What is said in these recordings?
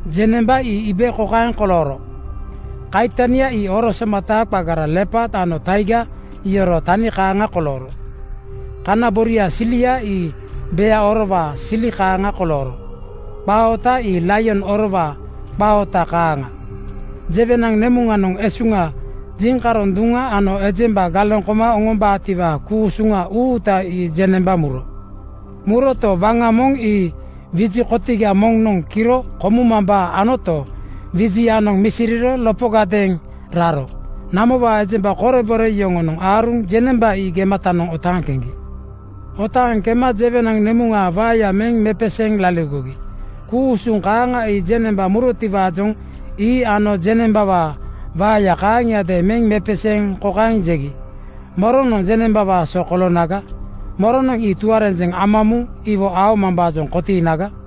Jeŋnemba ii iibe kokaeŋ kolooro: Kaitania ii oro somata qagara lepaad ano taiga iyoroo tani kaaŋa kolooro. Kana boriaa silia ii bea orowaa sili kaaŋa kolooro. Qaa oota ii laion orowaa qaa oota kaaŋa. Jewenaŋ nemuŋanoŋ esuŋa, jiŋkaroŋ duŋa ano ejemba galeŋ koma oŋombaatiwaa ku-usuŋa uuta ii jeŋnemba muro. Muroto, waŋa moŋ ii wiji kotiga moŋnoŋ kiro komumambaa anoto, wijianoŋ misiriro lopogadeeŋ raro. Namowaa ejemba korebore yoŋonoŋ aaruŋ jeŋnemba ii gematanoŋ otaaŋ keŋgi. Otaaŋ kema jewenaŋ nemuŋaa waeya meŋ mepeseeŋ laligogi. Ku-usuŋ kaaŋa ii jeŋnemba murotiwaajoŋ ii ano jeŋnembawaa waeya kaaŋiadeeŋ meŋ mepeseeŋ kokaeŋ jegi, “Moronoŋ jeŋnembawaa so koloonaga? Moronoŋ ii tuarenjeŋ ama muŋ iwo aomambaajoŋ kotiinaga?”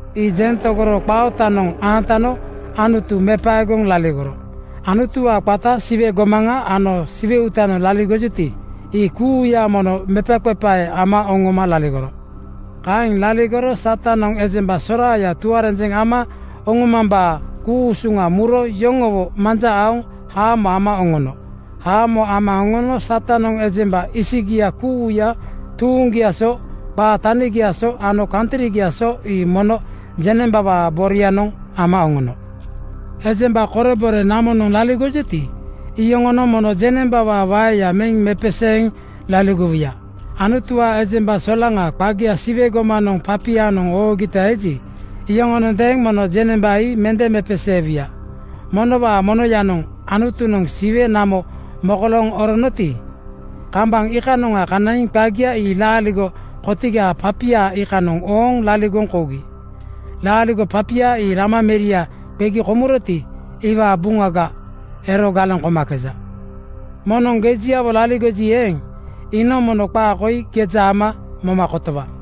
Ii jeŋ tegoro qaa ootanoŋ aantano Anutu mepaegoŋ laligoro. Anutuwaa qata, Siwe gomaŋa ano Siwe uutanoŋ laligojuti, ii kuuya mono mepaqepae ama oŋoma laligoro. Kaeŋ laligoro Satanoŋ ejemba soraaya tuarenjeŋ ama oŋomambaa ku-usuŋa muro yoŋowo manja aoŋ haamo ama oŋono. Haamo ama oŋono Satanoŋ ejemba isigia kuuya tuuŋgiaa so, qaa tanigiaa so ano kantrigiaa so ii mono jeŋnembawaa borianoŋ ama oŋono. Ejemba korebore namonoŋ laligojuti, iyoŋonoŋ mono jeŋnembawaa waeya meŋ mepeseeŋ laligowuya. Anutuwaa ejemba solaŋa qagia Siwe gomanoŋ papianoŋ oogita eji, iyoŋonondeeŋ mono jeŋnemba ii mende mepeseewuya. Monowaa monoyanoŋ Anutunoŋ Siwe namo mokolooŋ oronoti, kambaŋ iikanoŋa kanaiŋ qagia ii laaligo kotigaa papia iikanoŋ ooŋ laligoŋ kougi. Laaligo papia ii Lama meria qegi komuroti, iwaa buŋaga ero galeŋ komakeja. “Moŋnoŋ gejiawo laligoji eeŋ, iinoŋ mono qaa koi geja ama moma kotowa!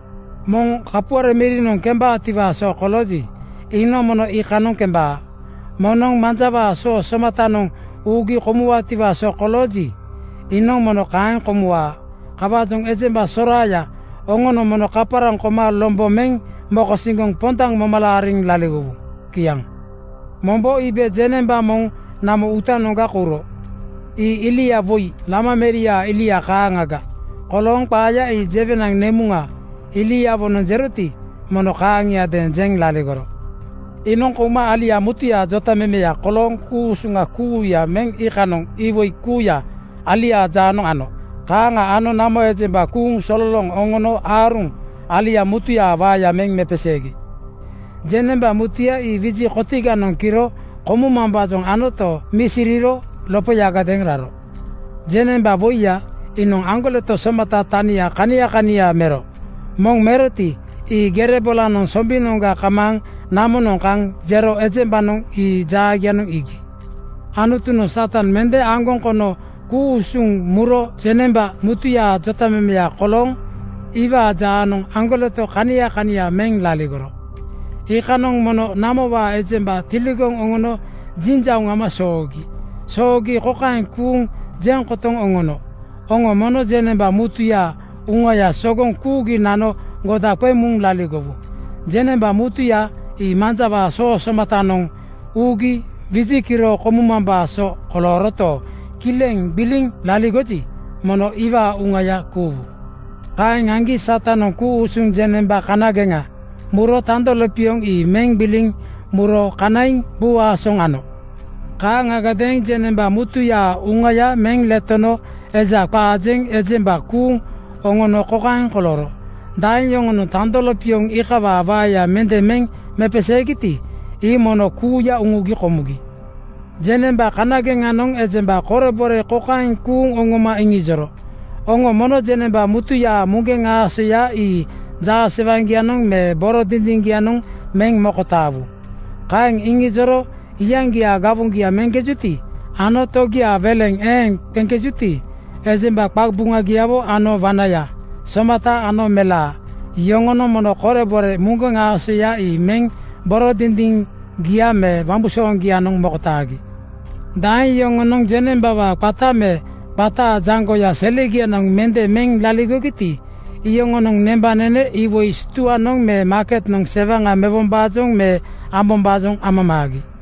Moŋ kapuare mirinoŋ kembaatiwaa so kolooji, iinoŋ mono iikanoŋ kembaa. Moŋ manjawaa soo somatanoŋ uugi komuwaatiwaa so kolooji, iinoŋ mono kaeŋ komuwaa. Kawaajoŋ ejemba soraaya, oŋonoŋ mono kaparaŋ koma lombo meŋ mokosiŋgoŋ pondaŋ moma laariŋ laligowu.” Kiaŋ. Mombo iibe jeŋnemba moŋ namo uutanoŋga kouro. Ii ilia woi Lama meriaa ilia kaaŋaga kolooŋ qaaya ii jewenaŋ nemuŋa iliawonoŋ jeroti, mono kaaŋiadeeŋ jeŋ laligoro. Iinoŋ kouma alia mutuyaa jotamemeya kolooŋ ku-usuŋa kuuya meŋ iikanoŋ iwoi kuuya aliaa jaanoŋ ano. Kaaŋa ano namo ejemba kuuŋ sololooŋ oŋono aaruŋ alia mutuyaa waeya meŋ mepeseegi. Jeŋnemba mutuya ii wiji kotiganoŋ kiro komumambaajoŋ anoto, misiriro lopoyadeeŋ raro. Jeŋnemba woiya iinoŋ aŋgoleto somata tania kania kania mero. Moŋ meroti, ii gere bolanoŋ sombinoŋga kamaaŋ namonoŋ kaŋ jero ejembanoŋ ii jaagianoŋ iigi. Anutunoŋ Satan mende aŋgoŋ kono ku-usuŋ muro jeŋnemba mutuyaa jotamemeya kolooŋ iwaa jaanoŋ aŋgoleto kania kania meŋ laligoro. Iikanoŋ mono namowaa ejemba tiligoŋ oŋono jinjauŋ ama soogi. Soogi kokaeŋ kuuŋ jeŋ kotoŋ oŋono, “Oŋo mono jeŋnemba mutuyaa uŋaya sogoŋ kuugi nano goda qeŋ muŋ laligowu. Jeŋnemba mutuya ii manjawaa soo somatanoŋ (bainat) uugi wiji kiro komumambaa so kolooroto, kileŋ gbiliŋ laligoji, mono iwaa uŋaya kuuwu.” Kaeŋ aŋgi Satanoŋ ku-usuŋ jeŋnemba kanageŋa muro tando lopioŋ ii meŋ gbiliŋ muro kanaiŋ buu aasoŋ ano. Kaaŋagadeeŋ jeŋnemba mutuyaa uŋaya meŋ letono eja qaa jeŋ ejemba kuuŋ oŋono kokaeŋ kolooro: Daeŋ yoŋonoŋ tando lopioŋ iikawaa waeya mende meŋ mepeseegiti, ii mono kuuya uŋugi komugi. Jeŋnemba kanageŋanoŋ ejemba korebore kokaeŋ kuuŋ oŋoma iŋijoro, “Oŋo mono jeŋnemba mutuyaa muŋgeŋ aasoya ii jaasewaŋgianoŋ me boro dindiŋgianoŋ meŋ mokotaawu.” Kaeŋ iŋijoro iyaŋgiaa gawoŋgia meŋkejuti ano togiaa weleŋ eeŋ qeŋkejuti, ejemba qaqabuŋayawo ano wanaya, somata ano melaa yoŋonoŋ mono korebore muŋgeŋ aasoya ii meŋ boro dindiŋgia me wambusooŋgianoŋ mokotaagi. Daeŋ yoŋonoŋ jeŋnembawaa qata me qataa jaŋgoya selegianoŋ mende meŋ laligogiti, iyoŋonoŋ nembanene iwoi stuanoŋ me maaketnoŋ sewaŋa mewombaajoŋ me ambombaajoŋ amamaagi.